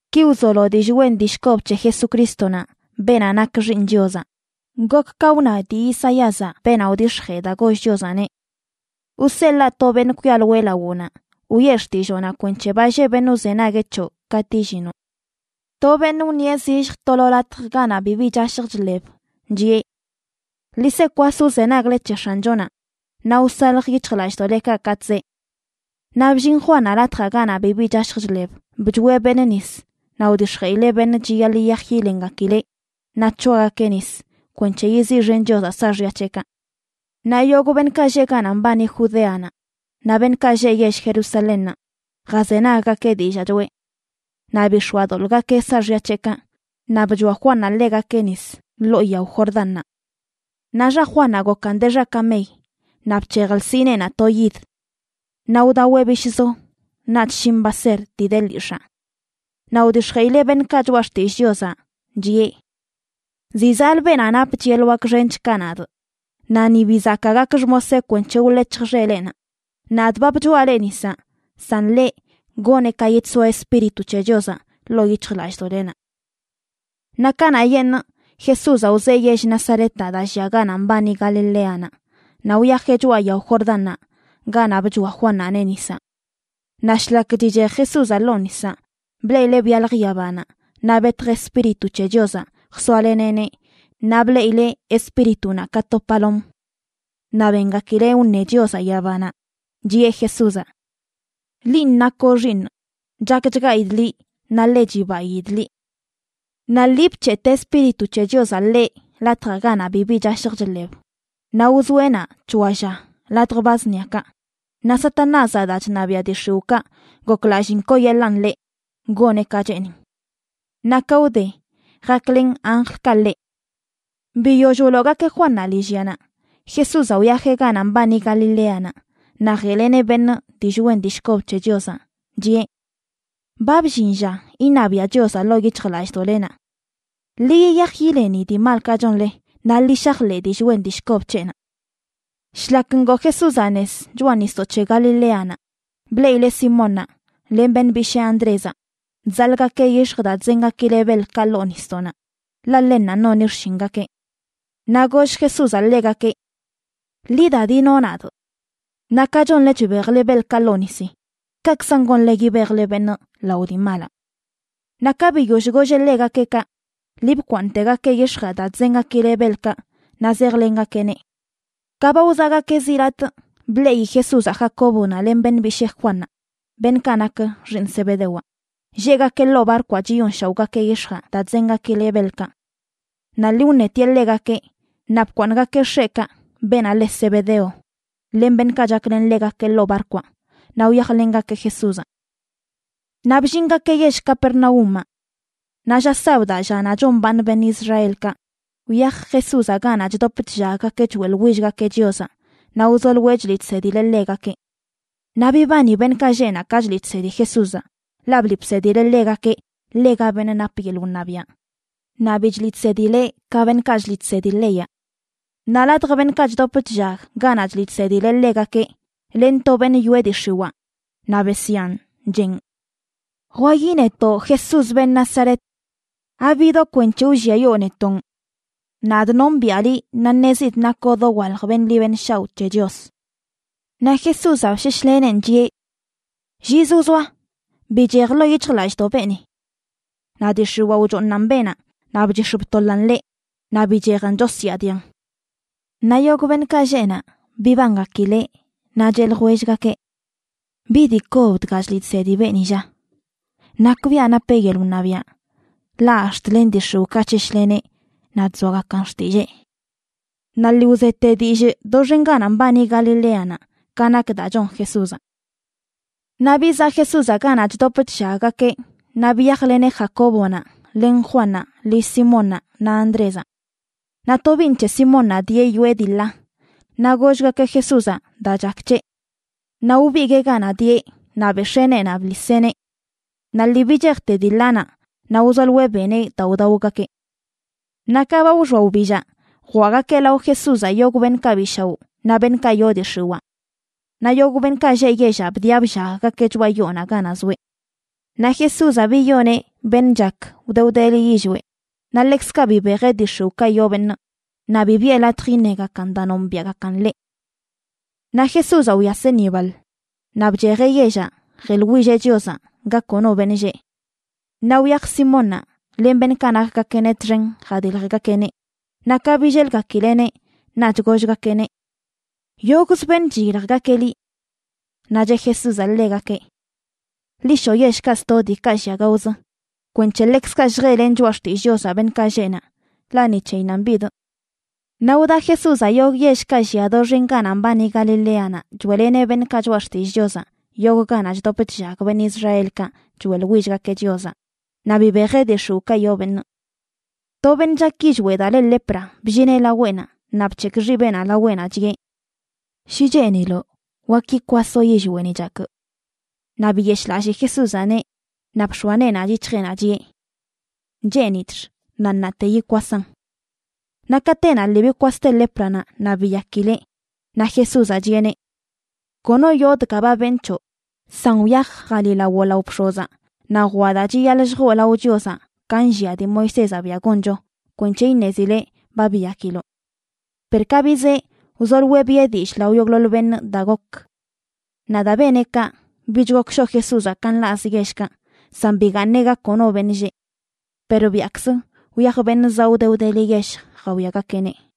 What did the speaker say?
Ki wzolo dillꞌ wen dillꞌ kob c̱he Jesucrístonaꞌ, beenaꞌ nak Xiiṉ Chiozaꞌ. Gok ka wna dii Isaíazaꞌ, beenaꞌ wdix̱jee daa goll Chiozaꞌneꞌ: Wseḻaa to beṉꞌ kwialoeꞌ lawoꞌnaꞌ, wiꞌe xtilloonaꞌ kwenc̱he ba lleꞌ beṉꞌ wzenagueꞌ c̱hoꞌ katꞌ illinoꞌ. To beṉꞌ wṉieꞌ zilljə to lo latj ganaꞌ bibi chashj chḻeb, chiꞌe: “Ḻi se kwas wzenagle c̱he X̱anchonaꞌ naꞌ wsalj yic̱hjlallꞌdoꞌlekaꞌ katꞌ zee.” Naꞌ bllin Juannaꞌ latjaꞌ ganaꞌ bibi chashj chḻeb. Bchoeꞌ beṉꞌ nis, naꞌ wdix̱jeꞌileꞌ beṉꞌ chiyaḻꞌ yiyaj yilengakileꞌ naꞌ c̱hoagakeꞌ nis kwenc̱he yiziꞌxen Chiozaꞌ saaxya c̱heꞌkaꞌ. Naꞌ yogꞌ beṉꞌkaꞌ lleꞌ ganaꞌ mbani Judeanaꞌ naꞌ beṉꞌkaꞌ lleꞌ yell Jerusalénnaꞌ jazenaggakeꞌ dillaa choꞌe. Naꞌ bix̱oadoḻꞌgakeꞌ saaxya c̱heꞌkaꞌ, naꞌ bchoa Juannaꞌ ḻegakeꞌ nis ḻoo yao Jordánnaꞌ. Naꞌ xa Juannaꞌ gokan de xa kamey naꞌ bc̱hej lsineenaꞌ to yid. Naꞌ wdaweꞌ bishꞌzo naꞌch shin baser dii de lyix̱aa. Naꞌ wdix̱jeꞌileꞌ beṉꞌkaꞌ choꞌa xtillꞌ Chiozaꞌ, chiꞌe: ―Ziꞌ zaꞌlə beenaꞌ napch yeḻꞌ wak xench ka nadꞌ, naꞌ ni bi zakaa gakꞌ xmoseꞌ kwenc̱he wḻec̱hjꞌ xeleꞌnaꞌ. Nadꞌ ba bchoaꞌ leꞌ nisaꞌ, san ḻeꞌ, goneꞌ ka yidsoa Espíritu c̱he Chiozaꞌ ḻoo yic̱hjlallꞌdoꞌlenaꞌ. Naꞌ kanaꞌyeṉꞌ Jesúzaꞌ wzee yell Nazaretaꞌ daa llia ganaꞌ mbani Galileanaꞌ naꞌ wyajeꞌ choꞌa yao Jordánnaꞌ ganaꞌ bchoa Juannaꞌneꞌ nisaꞌ. Naꞌ shlak chichej Jesúzaꞌ ḻoo nisaꞌ, bleꞌileꞌ byalj yabanaꞌ naꞌ betj Espíritu c̱he Chiozaꞌ jsoaleneꞌneꞌ naꞌ bleꞌileꞌ Espíritunaꞌ ka to palom. Naꞌ bengakileꞌ wṉe Chiozaꞌ yabanaꞌ, chiꞌe Jesúzaꞌ: ―Linꞌ nakoꞌ Xiiṉꞌ, chakchgaidꞌ liꞌ naꞌ ḻe chibaidꞌ liꞌ. Naꞌ lii bc̱heꞌte Espíritu c̱he Chiozaꞌ ḻeꞌ latjaꞌ ganaꞌ bibi chashj chḻeb. Naꞌ wzoeꞌ naꞌ c̱hoa lla ladj ba zṉiakaꞌ, naꞌ Satanázaꞌ daa chṉabiaꞌ dii x̱iwꞌkaꞌ goklalliin kooyeḻaꞌn ḻeꞌ goneꞌ ka cheenin. Naꞌ ka wde, jaklen anjlkaꞌ ḻeꞌ. Biyoll wloogakeꞌ Juannaꞌ lillyanaꞌ, Jesúzaꞌ wyajeꞌ ganaꞌ mbani Galileanaꞌ naꞌ jeꞌleneꞌ beṉꞌ dillꞌ wen dillꞌ kob c̱he Chiozaꞌ, chiꞌe: ―Ba bllin lla iṉabiaꞌ Chiozaꞌ ḻoo yic̱hjlallꞌdoꞌlenaꞌ. Ḻi yiyaj yileni dii malkaꞌ chonle naꞌ ḻi shajḻeꞌ dillꞌ wen dillꞌ kob c̱heꞌnaꞌ. Shlak ngoo Jesúzaꞌ nez choꞌa nisdoꞌ c̱he Galileanaꞌ, bleꞌileꞌ Simónnaꞌ len beṉꞌ bishee Andrézaꞌ, chzaḻꞌgakeꞌ yix̱j daa chzengakileꞌ beḻkaꞌ ḻoo nisdoꞌnaꞌ, ḻaꞌ ḻennanꞌ noni xshingakeꞌ. Naꞌ goll Jesúzaꞌ ḻegakeꞌ: ―Ḻi da, dino nadꞌ. Naꞌ ka chonle chbejle beḻkaꞌ ḻoo nisi, kaꞌkzan gonle yibejle beṉꞌ lao dii malaꞌ. Naꞌ ka biyoll golleꞌ ḻegakeꞌ kaꞌ, lii bkwaaṉꞌtegakeꞌ yix̱jaꞌ daa chzengakileꞌ beḻkaꞌ naꞌ zejlengakeꞌneꞌ. Ka ba wzaꞌgakeꞌ zi latꞌ, bleꞌi Jesúzaꞌ Jacóbonaꞌ len beṉꞌ bishee Juannaꞌ, beṉꞌkaꞌ nak xiiṉ Zebedewaꞌ, lleꞌgakeꞌ ḻoo barkwaꞌ chiyonshaoꞌgakeꞌ yix̱jaꞌ daa chzengakileꞌ beḻkaꞌ. Naꞌ lii wṉetieꞌ ḻegakeꞌ, naꞌ bkwaaṉꞌgakeꞌ x̱eꞌkaꞌ, beenaꞌ le Zebedeo, len beṉꞌkaꞌ chaklen ḻegakeꞌ ḻoo barkwaꞌ, naꞌ wyajlengakeꞌ Jesúzaꞌ. Naꞌ bllingakeꞌ yell Carpernaúmaꞌ. Naꞌ lla sabdaꞌ, llanaꞌ chombaaṉ beṉꞌ Israelkaꞌ, wyaj Jesúzaꞌ ganaꞌ chdop chllaggakeꞌ choeꞌḻwillgakeꞌ Chiozaꞌ naꞌ wzoloeꞌ chliꞌ chsedileꞌ ḻegakeꞌ. Naꞌ bibani beṉꞌkaꞌ lleꞌ naꞌ ka chliꞌ chsedi Jesúzaꞌ, ḻaꞌ bliꞌ bsedileꞌ ḻegakeꞌ ḻega beṉꞌ nap yeḻꞌ wṉabiaꞌ, naꞌ bi chliꞌ chsedileꞌ ka beṉꞌkaꞌ chliꞌ chsedi leyaꞌ. Naꞌ ladj beṉꞌkaꞌ chdop chllag ganaꞌ chliꞌ chsedileꞌ ḻegakeꞌ, len to beṉꞌ yoꞌe dii x̱iwaa, naꞌ besyaan, cheꞌn: ―¡Jwayi netoꞌ, Jesús, beṉꞌ Nazaret! ¿Abidoꞌ kwenc̱he wlliayoo netonꞌ? Nadꞌ nombiꞌa liꞌ naꞌ ṉezidꞌ nakoꞌ dowalj beṉꞌ ḻi beṉꞌ shaoꞌ c̱he Chios. Naꞌ Jesúzaꞌ bsheshleneꞌn, chiꞌe: ―¡Llizə wzoa! ¡Bichej ḻoo yic̱hjlallꞌdoꞌ beeni! Naꞌ dii x̱iwaa wchooṉan beenaꞌ naꞌ bchix̱ btoḻan ḻeꞌ naꞌ bichejan chosyaadian. Naꞌ yogꞌ beṉꞌkaꞌ lleꞌ naꞌ bibangakileꞌ, naꞌ cheꞌ ljwellgakeꞌ: ―¿Bi dii kob dga chliꞌ chsedi beeni, lla? ¡Nakbiaꞌ napeꞌ yeḻꞌ wṉabiaꞌ, ḻaꞌ ax̱t len dii x̱iwꞌkaꞌ chsheshleneꞌ naꞌ chzoagakan xtillee! Naꞌ lii wzete dillꞌ doxen ganaꞌ mbani Galileanaꞌ ka nak daa chon Jesúzaꞌ. Naꞌ bizaꞌ Jesúzaꞌ ganaꞌ chdop chllaggakeꞌ naꞌ biyajleneꞌ Jacóbonaꞌ len Juannaꞌ lill Simónnaꞌ naꞌ Andrézaꞌ. Naꞌ tobiiṉ c̱he Simónnaꞌ dieꞌ yoꞌe dii ḻa. Naꞌ gollgakeꞌ Jesúzaꞌ daa chak c̱heꞌ. Naꞌ wbiguee ganaꞌ dieꞌ naꞌ bex̱ee neenaꞌ bḻiseꞌneꞌ. Naꞌ lii bichejte dii ḻanaꞌ naꞌ wzoloeꞌ beneꞌ daa wdaogakeꞌ. Naꞌ ka ba wxoa wbillaꞌ, jwaꞌgakeꞌ lao Jesúzaꞌ yogꞌ beṉꞌkaꞌ bi shaoꞌ naꞌ beṉꞌkaꞌ yoo dii x̱iwaa. Naꞌ yogꞌ beṉꞌkaꞌ lleꞌ yellaꞌ bdiꞌa bllaggakeꞌ choꞌa yoonaꞌ ganaꞌ zoeꞌ. Naꞌ Jesúzaꞌ biyoneꞌ beṉꞌ chak wde wdeli yillweꞌ. Naꞌ ḻekzkaꞌ bibejeꞌ dii x̱iwꞌkaꞌ yoo beṉꞌ, naꞌ bi biꞌe latj iṉegakan daa nombiaꞌgakan ḻeꞌ. Naꞌ Jesúzaꞌ wyaseꞌ ni baḻ, naꞌ bchejeꞌ yellaꞌ jeḻwilleꞌ Chiozaꞌ ga kono beṉꞌ lleꞌ. Naꞌ wyaj Simónnaꞌ len beṉꞌkaꞌ nakgakeꞌneꞌ txen jadiljgakeꞌneꞌ, naꞌ ka billelgakileꞌneꞌ naꞌch gollgakeꞌneꞌ: ―Yogꞌz beṉꞌ chiyiljgakeꞌ liꞌ. Naꞌ cheꞌ Jesúzaꞌ ḻegakeꞌ: ―Ḻi shoꞌ yellkaꞌ sto, diikaꞌ llia gaozə, kwenc̱he ḻekzkaꞌ lljeꞌlenꞌ choꞌa xtillꞌ Chiozaꞌ beṉꞌkaꞌ lleꞌ naꞌ, ḻaꞌ ni c̱heyinnanꞌ bidꞌ. Naꞌ wda Jesúzaꞌ yogꞌ yellkaꞌ llia doxen ganaꞌ mbani Galileanaꞌ choeꞌleneꞌ beṉꞌkaꞌ choꞌa xtillꞌ Chiozaꞌ yogꞌ ganaꞌ chdop chllag beṉꞌ Israelkaꞌ choeꞌḻwillgakeꞌ Chiozaꞌ, naꞌ bibejeꞌ dii x̱iwꞌkaꞌ yoo beṉꞌ. To beṉꞌ chak yillweꞌ daa le lepra bllineꞌ laweꞌnaꞌ naꞌ bc̱hekꞌ xibeꞌnaꞌ laweꞌnaꞌ, chiꞌe: ―Shi cheeniloꞌ, wak yikwasoꞌ yillweꞌni chakꞌ. Naꞌ biyeshꞌlallii Jesúzaꞌneꞌ, naꞌ bx̱oa neenaꞌ yic̱hjeꞌnaꞌ chiꞌe: ―Cheenidꞌx. Naꞌ ṉaate yikwasaꞌn. Naꞌ katenaꞌ lii bikwaste lépranaꞌ naꞌ biyakileꞌ. Naꞌ Jesúzaꞌ, chiꞌeneꞌ: ―Kono yoo dga ba benꞌ c̱hoꞌ. San wyaj jaliꞌlawoꞌ lao bx̱ozaꞌ, naꞌ jwaꞌ daa chiyaḻꞌ lljoo lao Chiozaꞌ ka nllia dii Moisézaꞌ biaꞌ goncho kwenc̱he iṉezileꞌ ba biyakiloꞌ. Per ka bizee, wzoloeꞌ biꞌe dillꞌ lao yogꞌḻoḻ beṉꞌ daa gokə. Naꞌ daa beneꞌ kaꞌ, bich gok shoꞌ Jesúzaꞌ ka nḻaꞌzə yellkaꞌ, san bigaaṉeꞌ ga kono beṉꞌ lleꞌ. Per biaꞌkzə wyaj beṉꞌ zaꞌ wde wdeli yell jawiagakeꞌneꞌ.